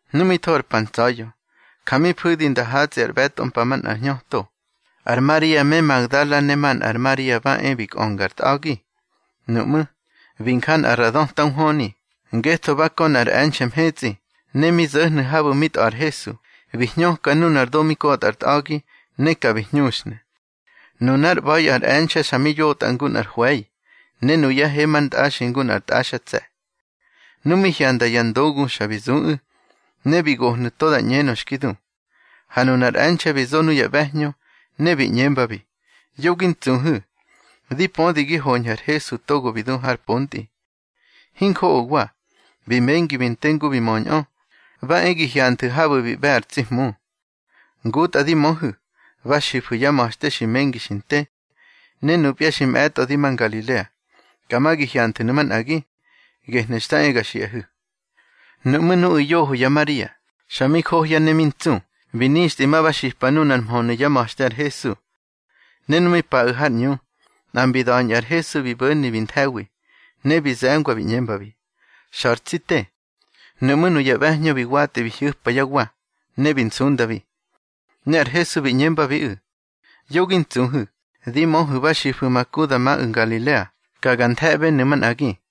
Nu mi tho ar pa ntsa̱ya̱, ja mi fu̱di nda hatsꞌi ár ꞌbe̱tꞌo mpa manꞌa hñöto, ar Maria me Magdala ne manꞌa ar Maria ba e bi kꞌönga ar tꞌa̱gi. Nuꞌmú̱, bi nja nꞌa ra döta nhwöni, ngetho ba kö nꞌar e̱nxe̱ mhetsꞌi. Ne mi zo̱hnu̱ habu̱ mi tꞌa̱ ar Hesu, bi hñöka nunar do mi kotꞌa ar tꞌa̱gi, ne ka bi hñuxhnu̱. Nunár ꞌba̱i ar e̱nxe̱ xa mi yotꞌa ngu nꞌar hwe̱i, ne nuyá he mar ntꞌaxi ngu nꞌar tꞌaxtse̱. Nu mi hyanda ya ndogu xa bi zuꞌu̱, ne bi gohnu̱ to da ꞌñenö xki du. Ha nunar e̱nxe̱ bi zo nuya ꞌbe̱hñö, ne bi ꞌñembabi: —Yo gi ntsuhu̱. Di pödi gi hoñhu̱ ar Hesu togo bi du har pontꞌi. Hinjoꞌowa, bi mengi bi nte ngu bi möñꞌö. Ba e gi hyanthu̱ habu̱ bi ꞌbe̱ ar tsi Hmu. Ngutꞌa di möhu̱, ba xifu̱ yá ma̱xte xi mengi xi nte. Ne nupya xi mꞌe̱tꞌo di ma Ngalilea, ka ma gi hyanthu̱nu̱ manꞌagi. Gehnu̱ xta e ga xiꞌahu̱. Nuꞌmú̱ nuꞌu̱ yoho ya Maria, xa mi johya ne mi ntsu, bi nixtꞌi ma ba xipa nunar mhönu̱ yá ma̱xte ar Hesu. Ne nu mi paꞌu̱ har ꞌñu, nꞌa mbi da̱ñꞌu̱ ar Hesu bi bo̱ni bi nthe̱wi, ne bi ze̱ngwa bi ꞌñembabi: —Xa̱ ar tsi te. Nuꞌmú̱ nuya ꞌbe̱hñö bi watꞌi bi hyu̱pa yá wa, ne bi nsundabi. Ne ar Hesu bi ꞌñembabiꞌu̱: —Yo gi ntsuhu̱. Di möhu̱ ba xifu̱ ma ku da maꞌu̱ Ngalilea, ka ga nthe̱ꞌbenu̱ manꞌagi.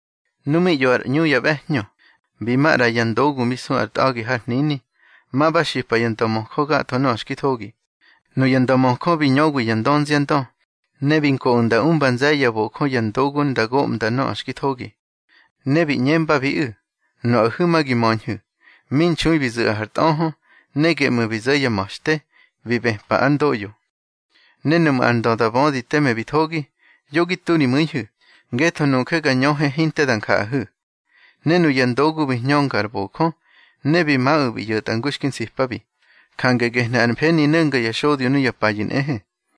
Nu mi ꞌyo ar ꞌñu ya ꞌbe̱hñö, bi ma ꞌra ya ndogu mi su ar tꞌa̱gi har hnini, ma ba xipa ya ndömöjö gatho nöꞌö xki thogi. Nuya ndömöjö bi ñöwi ya dönziandö, ne bi nkoꞌu̱ nda umba nze̱ye̱ ya bojö ya ndogu nda goꞌmnda nöꞌö xki thogi. Ne bi ꞌñembabiꞌu̱: —Nuꞌahu̱ ma gi möñhu̱, mi nxui bi zu̱ꞌahu̱ ar tꞌöhö, ne geꞌmu̱ bi zo̱ yá ma̱xte, bi bëpa ár ndoꞌyo. Ne nuꞌmu̱ ar ndö da bödi teme bi thogi, yo gi tu ri mu̱ihu̱, ngetho nuje ga ñöhe hinte da njaꞌahu̱. Ne nuya ndogu bi hñönga ar bojö, ne bi maꞌu̱ bi ꞌyo̱tꞌa ngu xki nsipabi. Jange gehnu̱ ar mfeni no̱nga ya xodyo nuya payu̱ nꞌehe.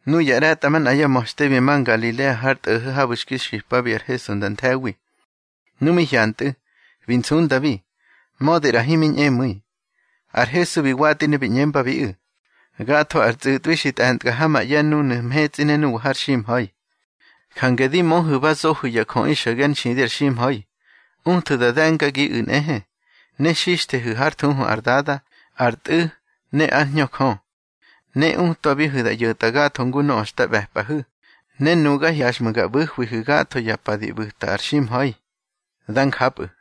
Nuya ꞌre̱tꞌamanꞌa yá ma̱xte bi ma Ngalilea har tꞌo̱ho̱ habu̱ xki xipabi ar Hesu nda nthe̱wi. Nu mi hyantꞌu̱, bi nsundabi, mödi ꞌra himi ñꞌemu̱i. Ar Hesu bi watꞌi ne bi ꞌñembabiꞌu̱: —Gatho ar tsꞌu̱tꞌwi xi tꞌe̱ntka ha ma ꞌye̱ núnu̱ mhetsꞌi ne nuwa har ximha̱i. Jange di möhu̱ ba zohu̱ ya jöꞌi xo̱ge ár nxidi ar ximha̱i. Uthu̱ da de̱ngagiꞌu̱ nꞌehe, ne xixthehu̱ hár thuhu ar Dada, ar Tꞌu̱ ne ár Hñö Jö. Ne utwabihu̱ da ꞌyo̱tꞌa gatho ngu nöꞌö xta ꞌbe̱pꞌahu̱. Ne nuga hyaxꞌmu̱ ga ꞌbu̱hwihu̱ gatho ya pa di ꞌbu̱ta ar ximha̱i. Dá njapꞌu̱.